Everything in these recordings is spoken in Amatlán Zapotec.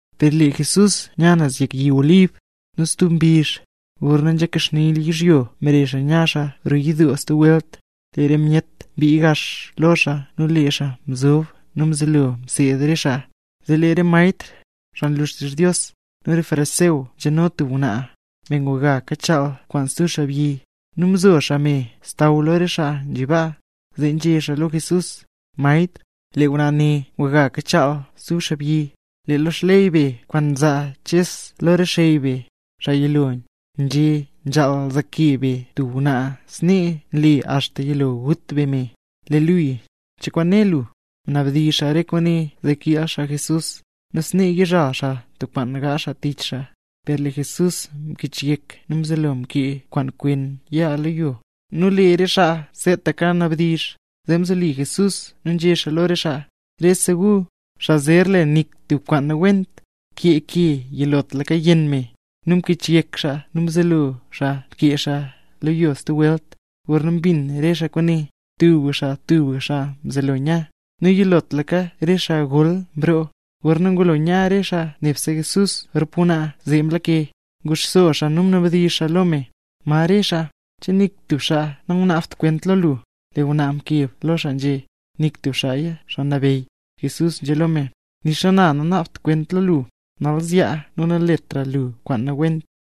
Per lee Jesús nya naz yek yi Olib. Nu stub mbizh, gorna mkaxni yizhyo mbare xaa naz roo yidoo stub welt. Lee re myet mbii gax lo xaa nu lee xaa mzob nu mzelo mseed xaa re xaa. Zee lee re maestr, xaa nlu xtizh Dios, nu re fariseo nzhano tub ngwnaa, me nguga kachaal kwaan stub xaabyi, nu mzo xaa me xsaww lo re xaa nzhi baa, zee nzhé xaa lo Jesús: —Maestr, lee ngwnaa ne nguga kachaal kwaan stub xaabyi. Lee lo xley be kwaan mzaa Ches lo re xey be, xaa yilo, nzhé nzhaal zaake be tub ngwnaa snee nle axta yilo gut be me. ¿Lee luya, cho kwaan né lu? Mnabdizh re xaa kwaane, zee kiil xaa Jesús, nu snee yizhal xaa tub kwaan gaazh xaa tich xaa. Per lee Jesús mkichyek nu mzelo mkee kwaan kwen yaa lo yo. Nu lee re xaa seetaka kanabdizh, zee mzoli Jesús nu nzhé xaa lo re xaa: —Rese gu, xaa zer le nik tub kwaan nawent, kee ke yilotlaka yenn me. Nu mkichyek xaa nu mzelo xaa mkee xaa lo yo stub welt. Gorna mbin re xaa kwaane, tubga xaa tubga xaa mzelo nya, nu yilotlaka re xaa gol mroo. Gorna ngulo nya re xaa nebse Jesús rop ngwnaa zee mlake, nguxso xaa nu mnabdizh xaa lo me: —¿Ma re me? ¿Che nik tub me nangunaabt kwent lo lu? Lee ngwnaa mkeb lo xaa, nzhé: —Nik tub meya, Me Nabeyy. Jesús nzhé lo me: —Nixa na, nanaabt kwent lo lu; nal zyaa nu naletra lu kwaan nawent.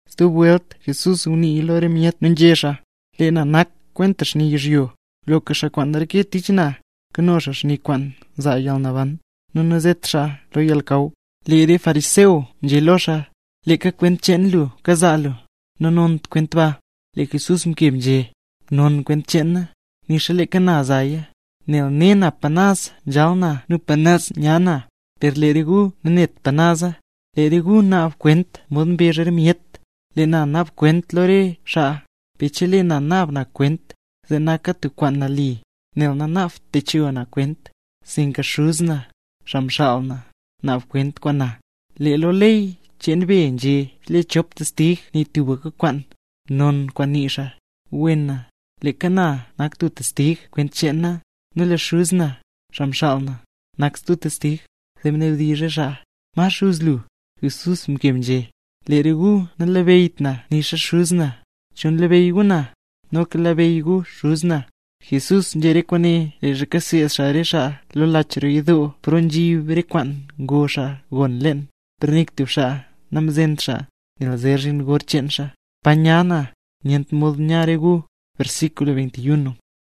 Stub welt Jesús ngunii lo re myet nu nzhé xaa: —Lee na nak kwenta xni yizhyo; loka xaa kwaan reke tich na, nkano xaa xni kwaan nzaa yalnaban, nu nazet xaa naz lo yalnakaw. Lee re fariseo nzhé lo xaa: —Leeka kwent cheen lu kazaa lu; nanont kwent ba. Lee Jesús mkeb nzhé: —Non kwent cheen na, nixa leeka na nzaya. Nel ne na pa naz nzhal na nu pa naz nya na; per lee re gu nanet pa naza. Lee re gu naab kwent mod mbezh re myet. Lee na nanaabt kwent lo re xaa; per chelee na naab na kwent, zee naka tub kwaan nali, nel nanaabt techo na kwent, sinka noka Xuz na, xaa mxaal na, naab kwent kwaan na. Lee lo ley cheen be nzhé, chelee chop testig nii tubka kwaan, non kwaan nii xaa. Wena, leeka na nak tub testig kwent cheen na, nu lee Xuz na, xaa mxaal na, nak stub testig. Zee mnabdizh re xaa: —¿Ma xuz lu? Jesús mkeb nzhé: —Lee re gu nanlabeyyt na nixa Xuz na, chol nlabeyy gu na, noka nlabeyy gu Xuz na. Jesús nzhé re kwaane leezha kaseed xaa re xaa lo lach roo yidoo, paro nzhib alkansi, pa ngo xaa gon leen. Per nik tub xaa namzent xaa, nel zer zhin gor cheen xaa. “Pa nya na, nyent mod ya re gu”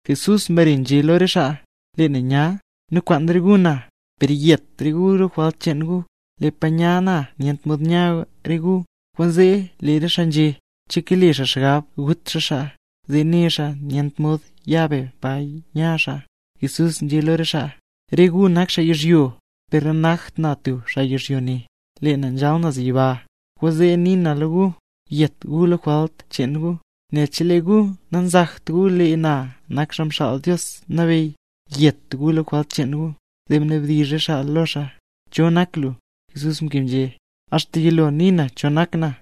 Jesús mbare nzhé lo re xaa: —Lee na nya, nu kwaan re gu na, per yet re gu lo jwalt cheen gu. Lee pa nya na nyent mod ya re gu. Kwaanzee lee re xaa nzhé: —¿Che kale xaa xgab gut xaa xaa, zee né xaa nyent mod ya be pa nya xaa? Jesús nzhé lo re xaa: —Re gu nak xaa yizhyo ne, per nanakt na tub xaa yizhyo ne, lee na nzhal naz yiba. Kwaanzee nii na lo gu, yet gu lo re jwalt cheen gu, nel chelee gu nanzakt gu lee na nak Xaa Mxaal Dios Nabeyy, yet gu lo re jwalt cheen gu. Zee mnabdizh re xaa lo xaa: —¿Cho nak lu? Jesús mkeb nzhé: —Axta yilo nii na cho nak na.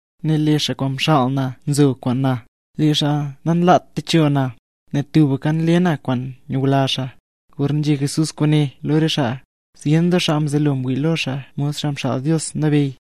Nel lee xaa kwaan mxaal na nzo kwaan na; lee xaa namlat techo na, nel tubka nle na kwaan nyula xaa. Gorna nzhé Jesús kwaane lo re xaa, zyen doo xaa mzelo ngwii lo xaa mod Xaa Mxaal Dios Nabeyy.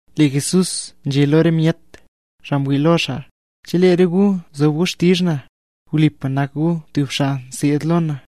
Lee Jesús nzhé lo re myet, xaa mwii lo xaa: —Chelee re gu zob gu xtizh na, wlipa nak gu tub xaa nseed lo na;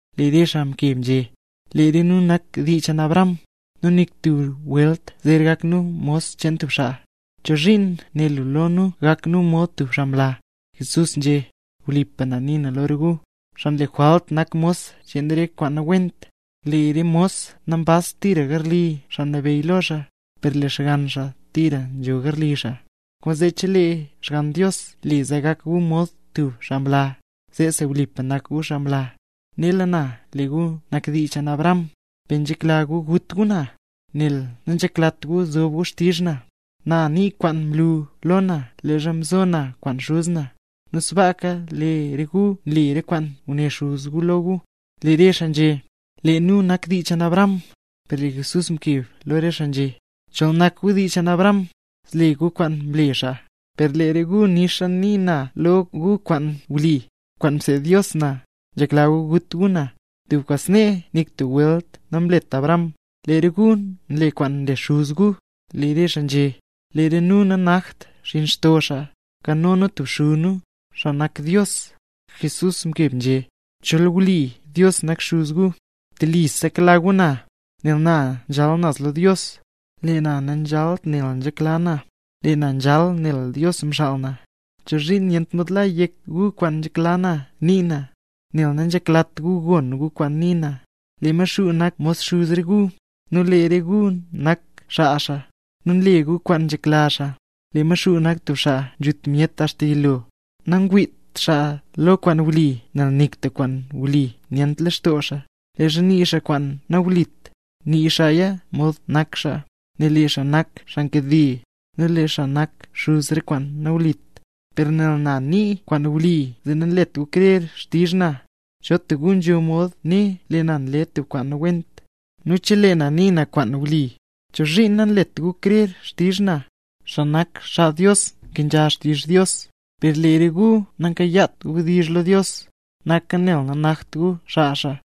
Lee re xaa mkeb nzhé: —Lee re nu nak dii cheen Abraham, nu nik tub welt zer gak nu mos cheen tub xaa; ¿chozhiin né lu lo nu, gak nu mod tub xaa mla? Jesús nzhé: —Wlipa na nii na lo re gu, xaa nle jwalt nak mos cheen re kwaan nawent. Lee tub mos nambazt tira garli xaa nabeyy lo xaa, per lee xgann xaa tira nzho garli xaa. Kwaanzee chelee xgann Dios le zee gak gu mod tub xaa mla, zeesi wlipa nak gu xaa mla. Nela na lee gu nak dii cheen Abraham; per nzhekla gu gut gu na, nel nanzheklat gu zob gu xtizh na. Na nii kwaan mlu lo na leezha mzo na kwaan Xuz na, nu sbaaka lee re gu nle re kwaan nguné xuz gu lo gu. Lee re xaa nzhé: —¡Lee nu nak dii cheen Abraham! Per lee Jesús mkeb lo re xaa nzhé: —Chol nak gu dii cheen Abraham, zle gu kwaan mle xaa. Per lee re gu nixa nii na lo gu kwaan wli, kwaan mseed Dios na, nzhekla gu gut gu na. ¡Tub kwaan snee nik tub welt namlet Abraham! Lee re gu nle kwaan nle xuz gu. Lee re xaa nzhé: —¡Lee re nu nanakt xinn xto xaa; nkano nu tubka xuz nu, xaa nak Dios! Jesús mkeb nzhé: —Chol wli Dios nak xuz gu, telisa nkela gu na, nel na nzhal naz lo Dios, lee na nanzhalt nel nzhekla na, lee na nzhal nel Dios mxaal na. ¿Chozhiin nyent mod la yek gu kwaan nzhekla na nii na? Nel nanzheklat gu gon gu kwaan nii na. Lee Maxuu nak mod xuz re gu; nu lee re gu nak xaa xaa, nu nle gu kwaan nzhekla xaa. Lee Maxuu nak tub xaa nzhut myet axta yilo. Nangwiit xaa lo kwaan wli nel nik tub kwaan wli nyent lextoo xaa. Leezha nii xaa kwaan nawlit, nii xaaya mod nak xaa; nel lee xaa nak xaa nkade, nu lee xaa nak xuz re kwaan nawlit. Per nel na nii kwaan wli zee nanlet gu krer xtizh na. ¿Cho tub gu nzho mod né lee na mle tub kwaan nawent? Nu cheleeya nii na kwaan wli, ¿chozhiin nanlet gu krer xtizh na? Xaa nak xaa Dios nkenzha xtizh Dios; per lee re gu namkayaat wdizh lo Dios, naka nel nanakt gu xaa xaa.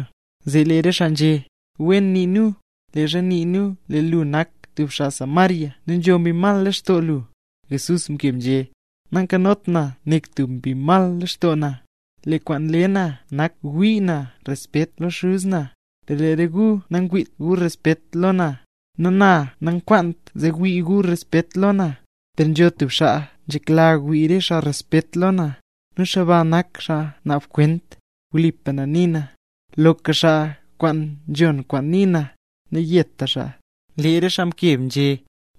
Zee lee re xaa nzhé: —Wen nii nu, leezha nii nu lee lu nak tub xaa Samaria nu nzho mbi mal lextoo lu. Jesús mkeb nzhé: —Nankanot na nik tub mbi mal lextoo na. Lee kwaan nle na nak ngwii na respet lo Xuz na; per lee re gu nangwiit gu respet lo na. Nu na nankwaant zee wii gu respet lo na, per nzho tub xaa nzhekla wii re xaa respet lo na, nu xaa ba nak xaa naab kwent. Wlipa na nii na, loka xaa kwaan nzhon kwaan nii na, nayeta xaa. Lee re xaa mkeb nzhé: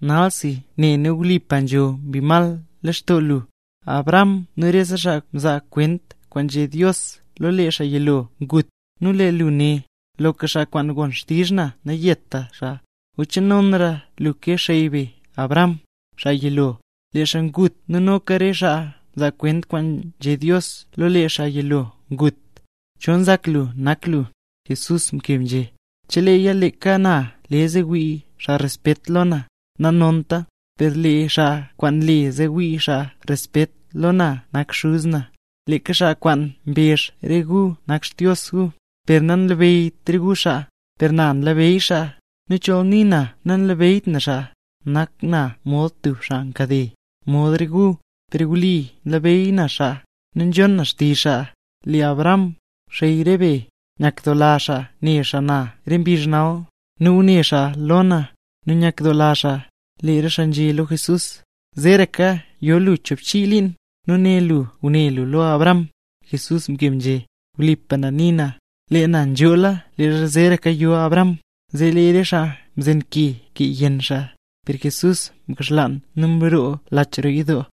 —Nalsi, ne nu wlipa nzho mbi mal lextoo lu. Abraham nu rese xaa mzaa kwent kwaan nzhé Dios lo lee xaa yilo ngut, nu lee lu né: “Loka xaa kwaan gon xtizh na nayeta xaa”. ¿O che nonra lu ke xey be Abraham, xaa yilo? Lee xaa ngut nu noka re xaa mzaa kwent kwaan nzhé Dios lo lee xaa yilo ngut. ¿Cho nzak lu nak lu? Jesús mkeb nzhé: —Cheleeya leeka na le zee wii xaa respet lo na, nanonta. Per lee xaa kwaan nle zee wii xaa respet lo na nak Xuz na, leeka xaa kwaan mbezh re gu nak Xdios gu. Per nanlabeyyt re gu xaa, per na nlabeyy xaa. Nu chol nii na nanlabeyyt na xaa, nak na mod tub xaa nkade, mod re gu. Per wli nlabeyy na xaa, nu nzhon na xtizh xaa. Lee Abraham, xey re be, nyakdoola xaa ne xaa na re mbizh nal; nu ngune xaa lo na, nu nyakdoola xaa. Lee re xaa nzhé lo Jesús: —¡Zeeraka yo lu choobchii liin, nu né lu ngune lu lo Abraham! Jesús mkeb nzhé: —¡Wlipa na nii na, lee na nzhoola leezha zeeraka yo Abraham! Zee lee re xaa mzen ke kee yenn xaa, per Jesús mkaxlaan nu mroo lach roo yidoo.